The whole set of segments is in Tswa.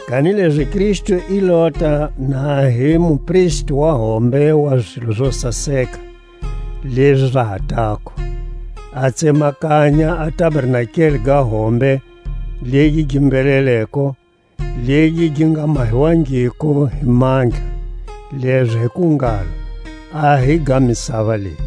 Kanilezi Kristu i lota na hi mupristi wa hombe wa zilo zo saseka lezi za ha tako; a tsemakanya a tabernakeli ga hombe legi gi mbheleleko, legi gi nga mahiwangiko hi mandla, lezo hi ku ngalo, a hi ga misava leyi.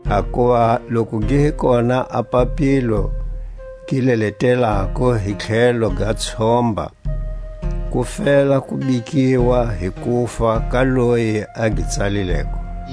Hakuva loku gi hi kona a papilo gi leletelako hi tlhelo ga tshomba, ku fela ku bikiwa hi kufa ka loyi a gi tsalileko.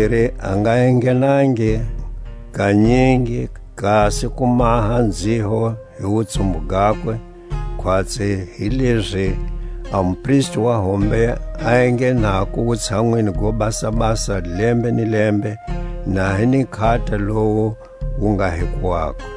Tlhatakumbiri, a nga enghenangi kanyingi kasi ku maha nzhiho hi wutsumbu gakwe, khwatsi hilezi a mupristi wa hombe a enghenako Wutshanwini go Basabasa lembe ni lembe, na hi ni nkhata lowu wu nga hiko wakwe.